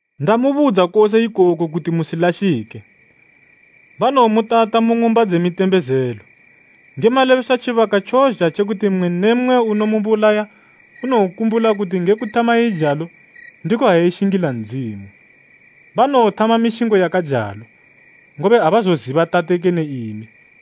“Ndamubudza kose ikoku kuti musilashike. Banowomutata mu ng'umba dze mitembezelo. Nge malebeswa tjibaka tjozha tje kuti mmwe ne mmwe unomubulaya unowokumbula kuti nge kuthama eijalo, ndiko ha eshingila Ndzimu. Banowothama mishingo yakajalo, ngobe abazoziba Tate kene imi.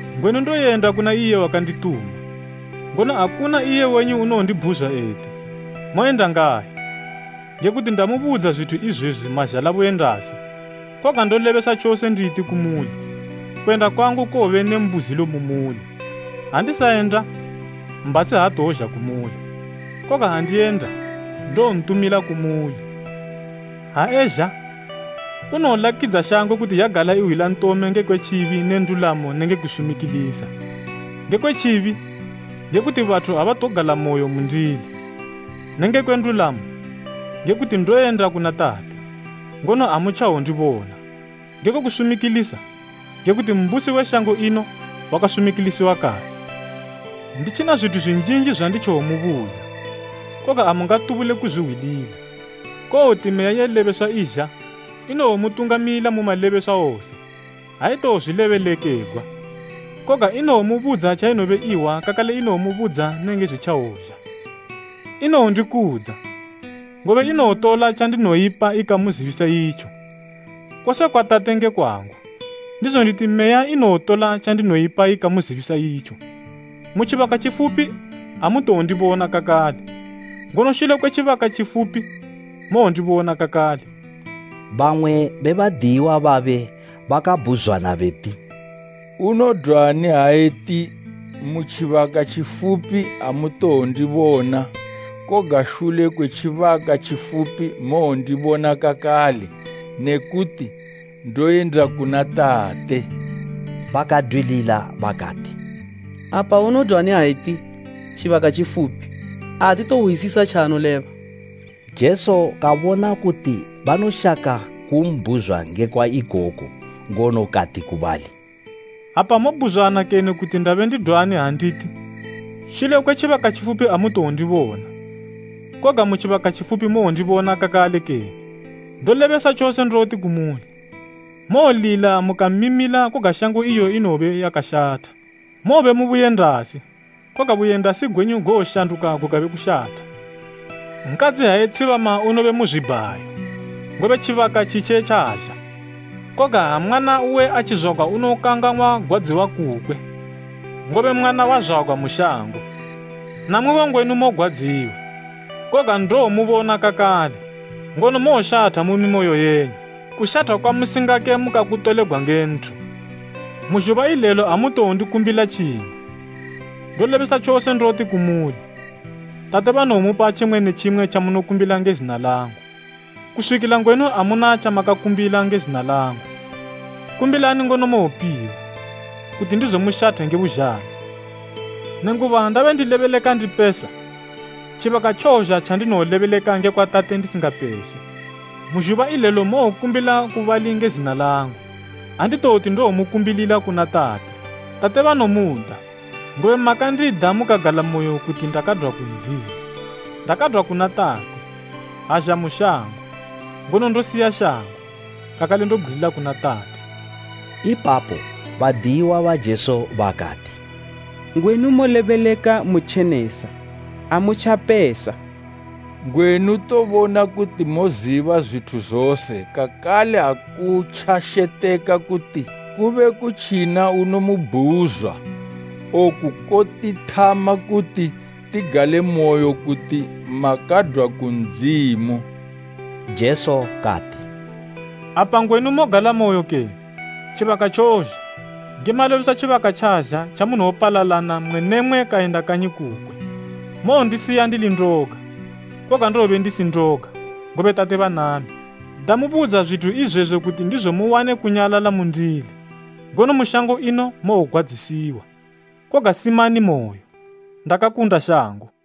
Ngwenu ndoyenda kuna iye wakandituma, ngono akuna iye wenyu unondibhuzwa eti, ‘Moyenda ngayi?’ Ngekuti ndamubudza zwithu izwezwi mazhala buyendasi. Koga ndolebesa tjose nditi kumuli, kuyenda kwangu kowobe ne mbuzilo mu muli. Ha ndisayenda, Mbhatshi atowozha kumuli, koga ha ndiyenda, ndowontumila kumuli. Ha ezha, unowolakidza shango kuti yagala ihwila ntome ngekwe tjibi ne ndulamo nenge kusumikilisa; ngekwe tjibi, ngekuti bathu abatogalamoyo mundili, ne ngekwe ndulamo, ngekuti ndoyenda kuna Tate, ngono amutjawondibona, ngekwe kusumikilisa, ngekuti mbusi we shango ino wakasumikilisiwa kale. “Nditjina zwithu zwinjinji zwanditjawomubudza, koga amungatubule kuzwihwilila. Kowoti Meya ye lebeswa izha, inowomutungamila mu malebeswa wose. Aitowozwilebelekegwa, koga inowomubudza tjainobe ihwa kakale inowomubudza nenge zwitjawozha. Inowondikudza, ngobe inowotola tjandinoipa ikamuzibisa itjo. Kose kwa Tate nge kwangu, ndizo nditi Meya inowotola tjandinoipa ikamuzibisa itjo. “Mu tjibaka tjifupi amutowondibona kakale. Ngono shule kwe tjibaka tjifupi mowondibona kakale.” Bamwe be badiyiwa babe bakabhuzwana beti, “Unodwani ha eti, ‘Mu tjibaka tjifupi amutowondibona, koga shule kwe tjibaka tjifupi mowondibona kakale,’ ne kuti, ‘Ndoyenda kuna Tate?’” Bakadwilila bakati, “Apa unodwani ha eti, ‘Tjibaka tjifupi?’ Atitohwisisa tjaanoleba.” Jesu kabona kuti banoshaka ku mbhuzwa ngekwa ikoku ngono kati ku bali, “Apa mobhuzwana kene kuti ndabe ndidwani ha nditi, ‘Shule kwe tjibaka tjifupi amutowondibona, koga mu tjibaka tjifupi mowondibona kakale kene?’ Ndolebesa tjose ndoti kumuli, mowolila mukamimila koga shango iyo inowobe yakashatha. Mowobe mu buyendasi, koga buyendasi gwenyu gowoshanduka gukabe kushatha. Nkadzi ha etshibama unobe mu zwibhayo, ngobe tjibaka tjitje tjazha, koga ha mwana uwe atjizwagwa unokangang'wa gwadziwa kukwe, ngobe mwana wazwagwa mu shango. Namwibo ngwenu mogwadziwa, koga ndowomubona kakale, ngono mowoshatha mu mimoyo yenyu. Kushatha kwamusingake mukakutolegwa nge nthu. “Mu zhuba ilelo amutowondikumbila tjimwe. Ndolebesa tjose ndoti kumuli, Tate banowomupa tjimwe ne tjimwe tjamunokumbila nge zina langu. Kuswikila ngwenu amuna tjamakakumbila nge zina langu, kumbilani ngono mowopiwa, kuti ndizo mushathe nge buzhalo. “Nenguba ndabe ndilebeleka ndipesa, tjibaka tjowozha tjandinowolebeleka ngekwa Tate ndisingapese. Mu zhuba ilelo mowokumbila ku bali nge zina langu. Anditoti ndowomukumbilila kuna Tate. Tate banomuda, ngobe makandida mukagalamoyo kuti ndakadwa ku Ndzimu. Ndakadwa kuna Tate, azha mu shango, ngono ndosiya shango, kakale ndobgwilila kuna Tate.” Ipapo badiyiwa ba Jesu bakati, “Ngwenu molebeleka mutjenesa, amutjapesa. Ngwenu tobona kuti moziba zwithu zose kakale akutjasheteka kuti kube kutjina unomubhuzwa. Oku kotithama kuti tigalemoyo kuti makadwa ku Ndzimu.” Jesu kati, “Apa ngwenu mogalamoyo kene? Tjibaka tjozha, nge malebeswa tjibaka tjazha tjamunowopalalana mmwe ne mmwe kayenda kanyi kukwe. Mowondisiya ndili ndoga. Koga ndowobe ndisi ndoga, ngobe Tate banami. Ndamubudza zwithu izwezwi kuti ndizo muwane kunyalala mundili. Ngono mu shango ino mowogwadzisiwa. Koga simanimoyo. Ndakakunda shango!”